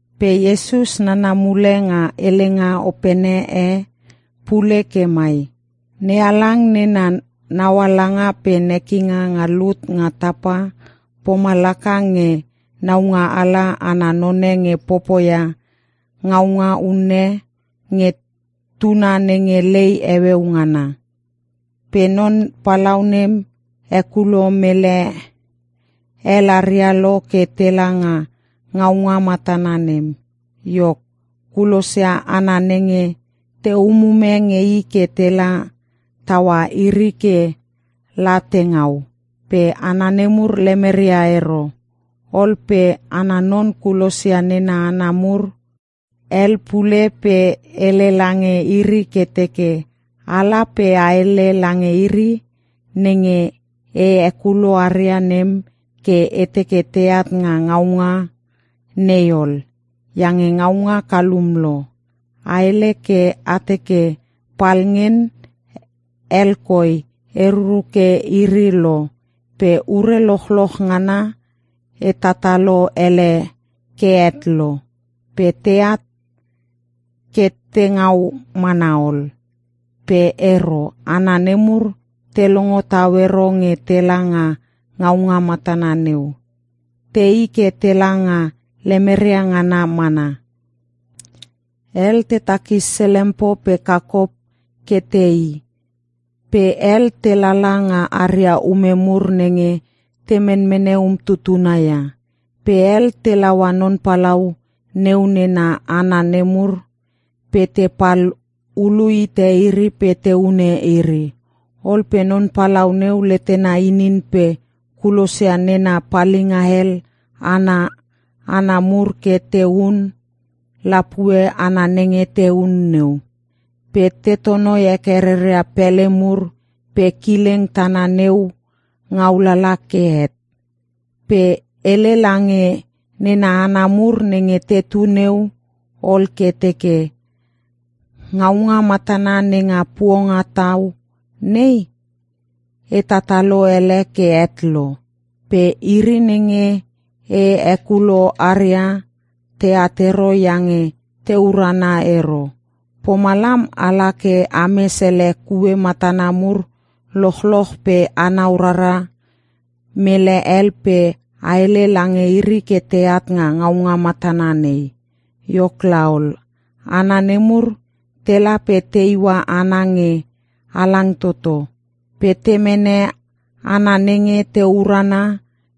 Pe Iesus nana mule nga helenga opene e pule ke mai, “NeHalang nena naualanga pe nekinga nga lut nga tapa, pomalaka nge naungaala ana none nge popoia ngaunga unne nge tuna nenge lei heueu ngana. Pe non palau nem hekulo mele hel aria lo ke tela nga ngaunga matana nem. Iok, kulosia hana nenge te umume nge i ke tela taua iri ke la te ngau, pe hana nemur lemeria ero. “Ol pe ana non kulosia nena hana mur hel pule pe hele lange iri ke teke, ‘Ala pe a hele lange iri nenge e hekulo aria nem ke e teke teat nga ngaunga nei ol, iange ngaunga kalum lo. A hele ke a teke palngen hel koi e ruruke iri lo, pe ure lochloch ngana e tatalo ele ke het lo. Pe teat ke te ngau mana ol!’ “Pe ero. Hana nemur te longo tau ero nge tela nga ngaunga matana neu. Tei ke tela nga lemeria ngana mana. Hel te takis selempo pe kakop ke teii, pe hel te lala nga aria ume mur nenge te menmene umtutuna ia. Pe hel te laua non palau neu nena hana nemur pe te pal hulu hite iri pe te hune iri. Ol pe non palau neu letena inin pe kulosia nena palinga hel ana hana mur ke te hun lapue hana nenge te hun neu, pe te tonoi heke reria pele mur pe kileng tana neu ngau lala ke het. “Pe hele lange nena hana mur nenge tetu neu ol ke teke, ‘Ngaunga matana nenga puongatau nei, e tatalo ele ke het lo. Pe iri nenge e hekulo aria teat ero iange te urana ero. Pomalam ala ke a mes ele kue matana mur lochloch pe anau rara mele hel pe a hele lange iri ke teat nga ngaunga matana nei.’ Iok laol, hana nemur tela pe te iua hana nge halang toto. Pe te mene hana nenge te urana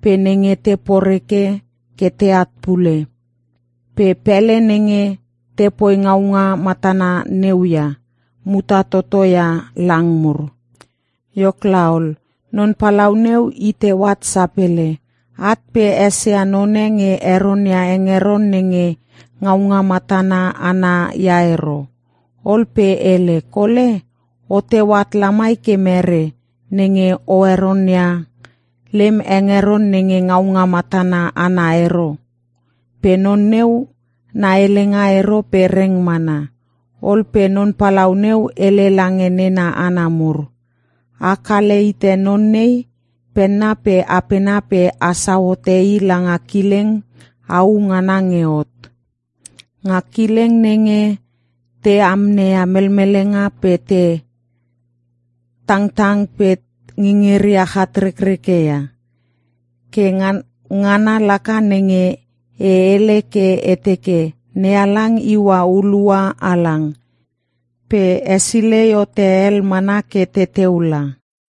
pe nenge te poreke ke teat pule. Pe pele nenge te poi ngaunga matana neu ia, muta toto ia lang mur. “Iok laol, non palau neu i teu at sapele. At pe esia none nge heronia hengeron nenge ngaunga matana ana ia ero. Ol pe hele, ‘Kole, o teu at lamai ke mere, nenge o heronia lem hengeron nenge ngaunga matana ana ero?’ Pe non neu na helenga ero pe reng mana. “Ol pe non palau neu hele lange nena hana mur, ‘A kale hite non nei penna pe apena pe a sau hote i langa kileng au ngana nge hot. Nga kileng nenge te amneia melmelenga pe te tangtang pe ngingiria chatrekreke ia.’ “Ke ngana laka nenge e hele ke e teke, ‘NeHalang iua hulua halang, pe hesilei hote hel mana ke teteu la.’”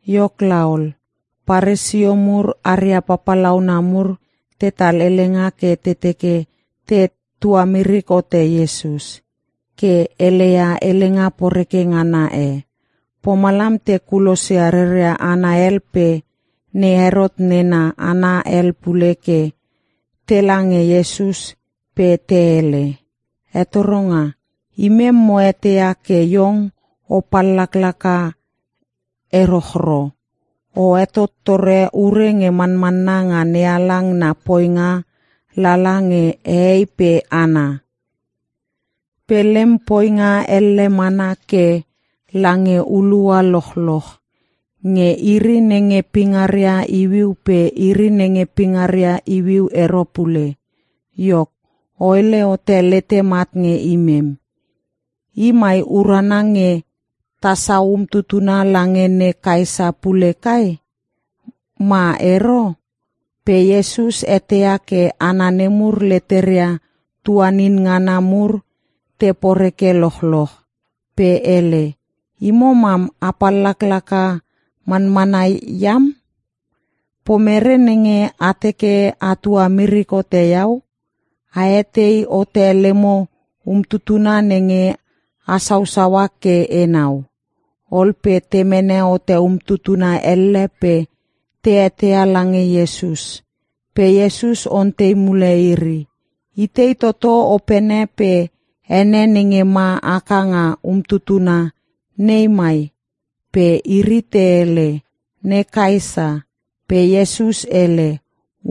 Iok laol, Paresio mur aria papalauna mur tetal helenga ke te teke te tuamirik hote Iesus, ke heleia helenga poreke ngana e. Pomalam te kulosia reria hana hel pe ne Herot nena hana hel pule ke tela nge Iesus pe te hele, “Hetoronga, imem mo eteia ke Iong o pallaklaka erochro. O hetottore ure nge manmanna nga NeHalang na poinga lala nge hehei pe hana. Pe lem poinga elle mana ke lange hulua lochloch. Nge iri nenge pingaria iuiu pe iri nenge pingaria iuiu ero pule. Iok, o hele hote letem at nge imem. I mai urana nge ta sau umtutuna lange ne Kaesa pule kai? Ma ero?” Pe Iesus eteia ke hana nemur leteria tuanin ngana mur te poreke lochloch. Pe hele, “Imo mam, a pallaklaka manmana iam! Pomerei nenge a teke a tuamirik hote Iau? A hetei hote lemo umtutuna nenge a sausaua ke enau.” Ol pe te mene hote umtuna elle pe te heteia lange Iesus. Pe Iesus ontei mule iri, “Itei toto opene pe ene nenge ma haka nga umtutuna nei mai?” Pe iri te hele, “Ne Kaesa.” Pe Iesus hele,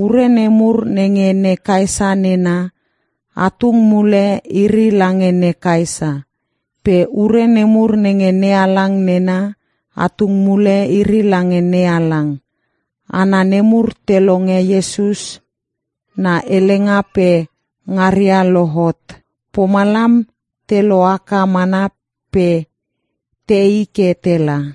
“Ure nemur nenge ne Kaesa nena, a tung mule iri lange ne Kaesa. Pe ure nemur nenge NeHalang nena, a tung mule iri lange NeHalang.” Hana nemur te longe Iesus na helenga pe ngaria lohot. Pomalam te lohaka mana pe tei ke tela.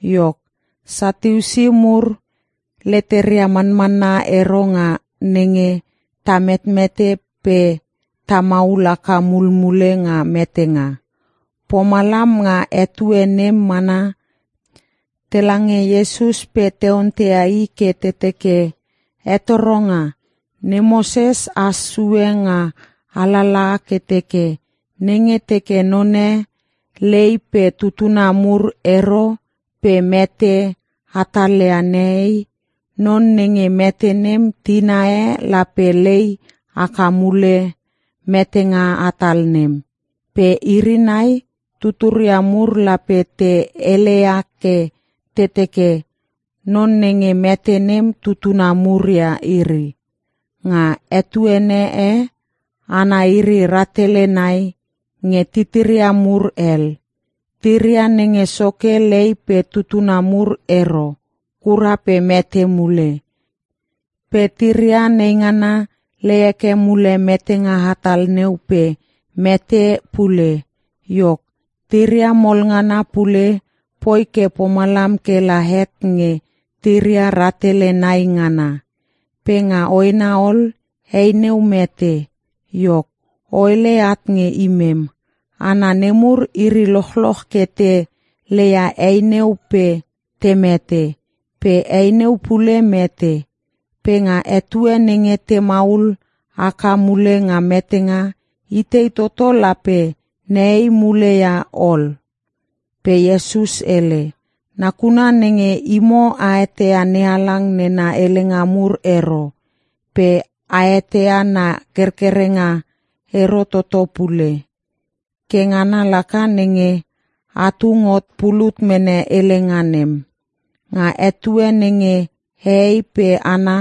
Iok, Satiusi mur leteria manmanna ero nga nenge ta metmete pe ta maul haka mulmule nga metenga. Pomalam nga etue nem mana tela nge Iesus pe te onteia I ke te teke, “Hetoronga, ne Moses has sue nga alalaha ke teke, nenge teke none lei pe tutuna mur ero pe mete hatalia nehei, non nenge mete nem tina e lape lei haka mule metenga hatal nem. Pe iri nai tuturia mur, lape te heleia ke te teke, non nenge mete nem tutuna mur ia iri. Nga etuene e, hana iri rahtele nai nge titiria mur hel. Tiria nenge soke lei pe tutuna mur ero kura pe mete mule. Pe tiria neingana lei heke mule metenga hatal neu pe mete pule. Iok, tiria mol ngana pule poi ke pomalam ke la het nge tiria rahtele nai ngana. Pe nga hoena ol, hei neu mete. Iok, o hele at nge imem. Hana nemur iri lochloch ke te leia hei neu pe te mete. Pe hei neu pule mete. Pe nga etue nenge te maul haka mule nga metenga, itei toto lape nehei mule ia ol?” Pe Iesus hele, “Nakuna nenge imo a eteia NeHalang nena helenga mur ero, pe a eteia na kerkerenga ero toto pule. Ke ngana laka nenge a tung hot pulut mene helenga nem. Nga etue nenge hehei pe hana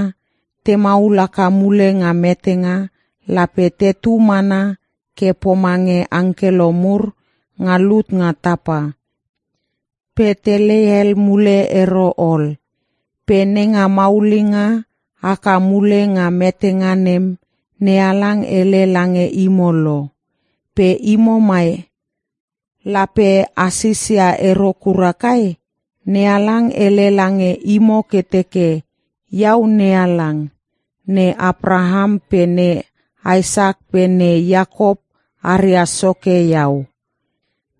te maul haka mule nga metenga, lape tetu mana ke pomange angkelo mur nga lut nga tapa, pe te lei hel mule ero ol. Pe nenga maulinga haka mule nga metenga nem, NeHalang hele lange imo lo. Pe imo mai, lape a sisia ero kura kai? NeHalang hele lange imo ke teke, ‘Iau NeHalang. ne Apraham pe ne Isak pe ne Iakop aria Soke Iau.’”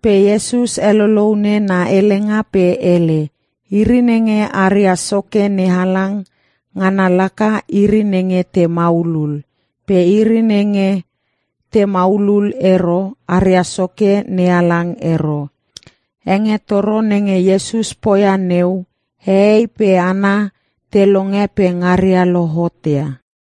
Pe Iesus heloloune na helenga pe hele, “Iri nenge aria Soke NeHalang, ngana laka, iri nenge te maulul. Pe iri nenge te maulul ero, aria Soke NeHalang ero.” Hengetoro nenge Iesus poia neu, hehei pe hana te longe pe ngaria lohotia.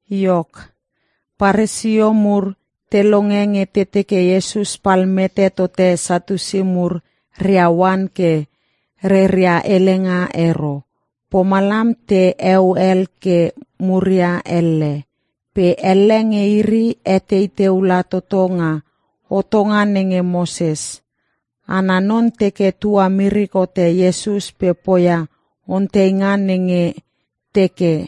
Iok, Paresio mur te longe nge te teke Iesus pal mete tote Satiusi mur rea oan ke reria helenga ero. Pomalam te eu hel ke muria elle. Pe elle nge iri etei teu la toto nga hotonga nenge Moses. Ana non teke tuamirik hote Iesus pe poia onteinga nenge teke,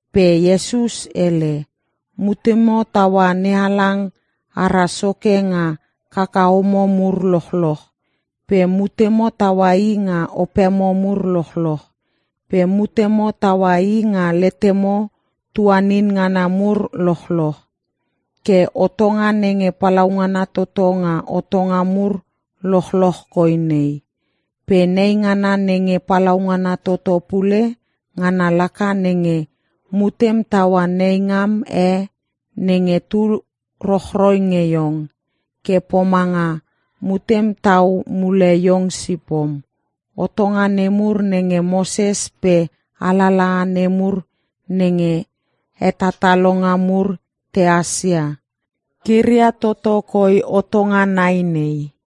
Pe Iesus hele, “‘Mutemo taua NeHalang ara Soke nga kakahomo mur lochloch, pe mutemo taua I nga opemo mur lochloch, pe mutemo taua I nga letemo tuanin ngana mur lochloch.’ Ke hotonga nenge palaungana toto nga hotonga mur lochloch koi nei. Pe neingana nenge palaungana toto pule, ngana laka nenge: ‘Mutem taua neingam e nenge tu rochroi nge iong, ke pomanga mutem tau mule iong sipom.’ Hotonga nemur nenge Moses pe alalaha nemur nenge hetatalonga mur tehas ia, kiria toto koi hotonga nai nei.”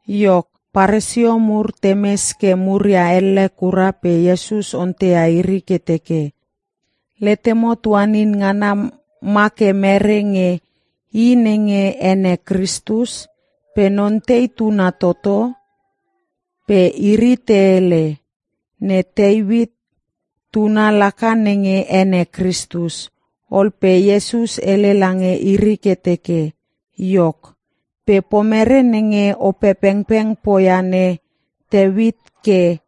Iok, Paresio mur te mes ke muria elle kura pe Iesus onteia iri ke teke, “Letemo tuanin ngana ma ke merei nge I nenge ene Kristus? Pe non tei tuna toto?” Pe iri te hele, “Ne Teuit Tuna laka nenge ene Kristus.” Ol pe Iesus hele lange iri ke teke, “Iok, pe pomere nenge Opepengpeng poia ne Teuit ke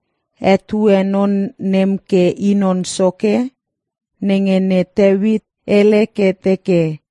hetue Non nem ke I Non Soke? Nenge ne Teuit hele ke teke,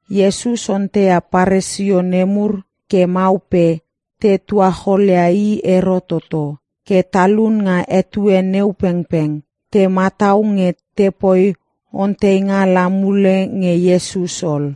Iesus onteia Paresio nemur ke mau pe te tuacholia I ero toto. Ke talun nga etue neu pengpeng, te matau nge te poi onteinga la mule nge Iesus ol.